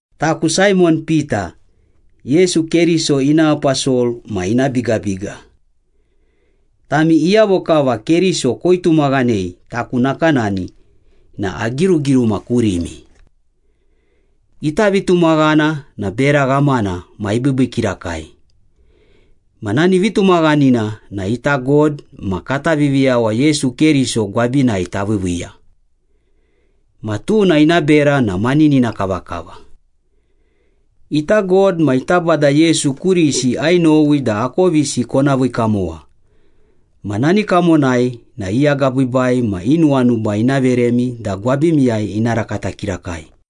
Taku Saimon Pita, Yesu Keriso ina aposol ma ina bigabiga. Tami iyavo kava Keriso koitumaghanei taku nakanani na agirugiruma kurimi. Ita vitumaghana na bera ghamana ma ibiibii kirakai. Ma nani vitumaghanina na ita God ma kata Viviyawa Yesu Keriso gwabinai taviiviiya. Ma tuna ina bera na maninina kavakava. Ita God ma ita Bada Yesu kurisi ainowi da akovisi kona vii kamowa ma nani kamonai na i agabiibai ma i nuwanuba ina veremi da gwabimiyai ina rakata kirakai.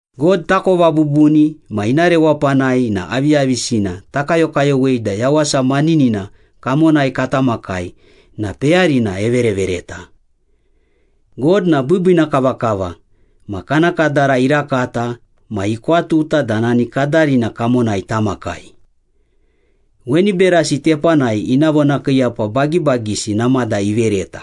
God takova bubuni ma ina rewapanai na aviyavisina takayokayowei da yawasa maninina kamonai kata makai na peyarina everevereta. God na biibiina kavakava ma kana kadara irakata ma ikwatuta da nani kadarina kamonai tamakai. Weni berasi tepanai ina vonakiiyapa bagibagisi namada ivereta.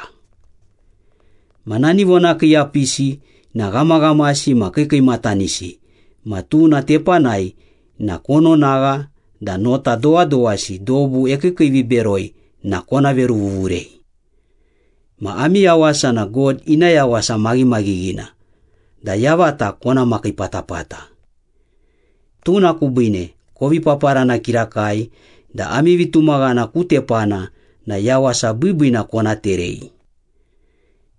Ma nani vonakiiyapisi na ghamaghamasi ma kiikiimatanisi ma tuna tepanai na kononagha da nota dowadowasi dobu ekiikiiviberoi na kona veruvuvurei. Ma ami yawasa na God ina yawasa maghimaghighina da yavata kona makii patapata. Tuna kubiine kovi paparana kirakai da ami vitumaghana ku tepana na yawasa biibiina kona terei.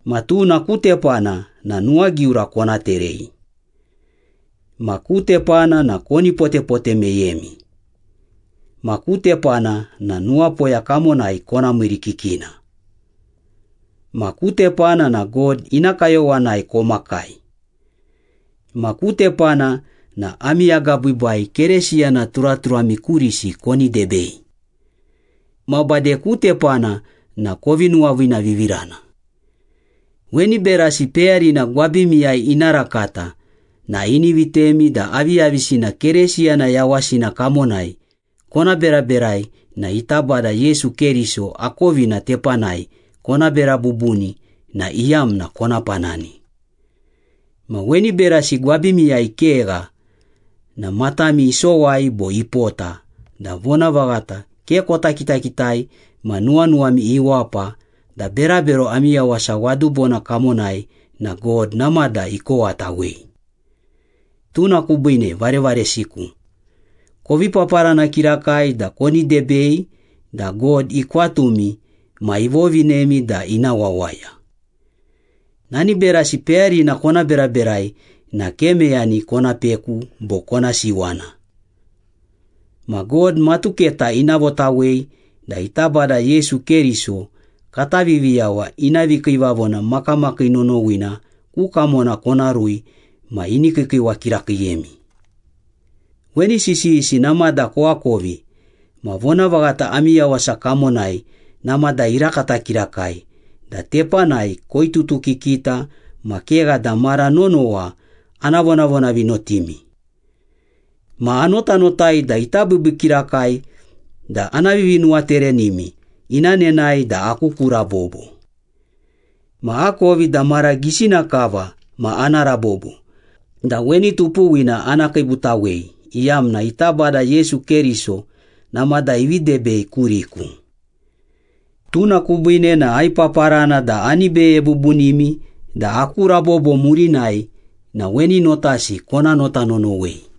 Ma tuna ku tepana na nuwagiura kona terei. Ma ku tepana na koni potepote meyemi. Ma ku tepana na nuwapoya kamonai kona miirikikina. Ma ku tepana na God ina kayowanai komakai. Ma ku tepana na ami agabiibai Keresiyana turaturami kurisi koni debei. Ma bade ku tepana na kovi nuwaviinavivirana. Weni berasi peyarina gwabimiyai ina rakata na ini vitemi da aviyavisina Keresiyana yawasina kamonai kona beraberai na ita Bada Yesu Keriso akovina tepanai kona bera bubuni na iyamna kona panani. Ma weni berasi gwabimiyai kegha na matami isowai bo ipota da vonavaghata ke kota kitakitai ma nuwanuwami iwapa da berabero ami yawasa wadubona kamonai na God namada ikowatawei. Tuna kubiine varevaresiku, kovi paparana kirakai da koni debei da God ikwatumi ma ivovinemi da ina wawaya. Nani berasi peyarina kona beraberai na ke meyani kona peku bo kona siwana. Ma God matuketa ina votawei da ita Bada Yesu Keriso, kata Viviyawa ina vikiivavona makamakii nonowina ku kamona kona rui ma ini kiikiiwa kirakiiyemi. Weni sisiyisi namada koakovi ma vonavaghata ami yawasa kamonai namada irakata kirakai da tepanai koitutukikita ma kegha da mara nonowa ana vonavonavinotimi. Ma anotanotai da ita biibii kirakai da ana vivinuwaterenimi ina nenae da aku ku rabobo. Ma akovi da mara gisina kava ma ana rabobo da weni tupuwina ana kiibutawei iyamna ita Bada Yesu Keriso namada ivi debei kuriku. Tuna kubiine na aipaparana da ani beye bubunimi da aku rabobo murinai na weni notasi kona nota nonowei.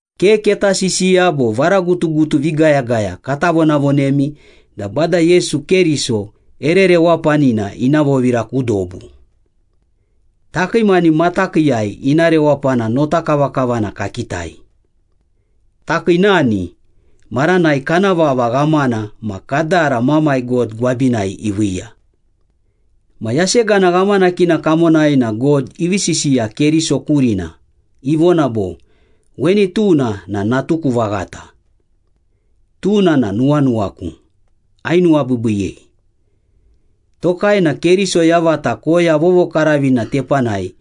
Ke keta sisiya bo varagutugutu vigayagaya kata vonavonemi da Bada Yesu Keriso ere rewapanina ina vovira ku dobu. Takii mani matakiiyai ina rewapana notakavakavana kakitai. Takii nani, maranai kana vava ghamana ma kadara Mamai God gwabinai iviiya. Ma yasegana ghamanakina kamonai na God ivi sisiya Keriso kurina, ivona bo, “Weni tuna na natuku vaghata. Tuna na nuwanuwaku, ainuwabiibiiyei.” Tokai na Keriso yavata koya vovokaravina tepanai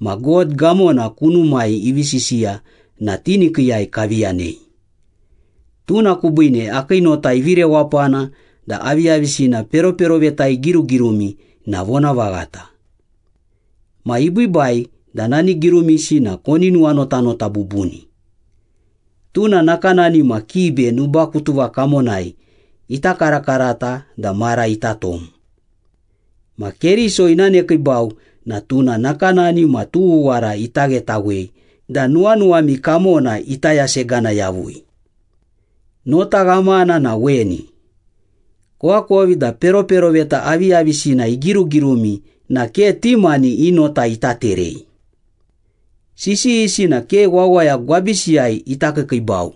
ma God gamona kunumai ivi sisiya na tinikiiyai kavi yanei. Tuna kubiine akii nota ivi rewapana da aviyavisina peroperoveta igirugirumi na vonavaghata. Ma ibiibai da nani girumisi na koni nuwanotanota bubuni. Tuna nakanani ma kibe nubakutuva kamonai ita karakarata da mara ita tom. Ma Keriso ina nekiibau na tuna nakanani ma tughuwara ita ghetawei da nuwanuwami kamona ita yasegana yavui. Nota ghamana na weni. Koakovi da peroperoveta aviyavisina igirugirumi na ke ti mani i nota ita terei. Sisiyisi na ke wawaya gwabisiyai ita kiikiibau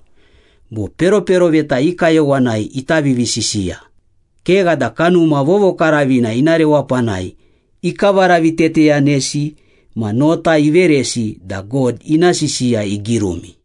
bo peroperoveta i kayowanai ita vivisisiya, kegha da Kanuma Vovokaravina ina rewapanai ikavaraviteteyanesi ma nota iveresi da God ina sisiya igirumi.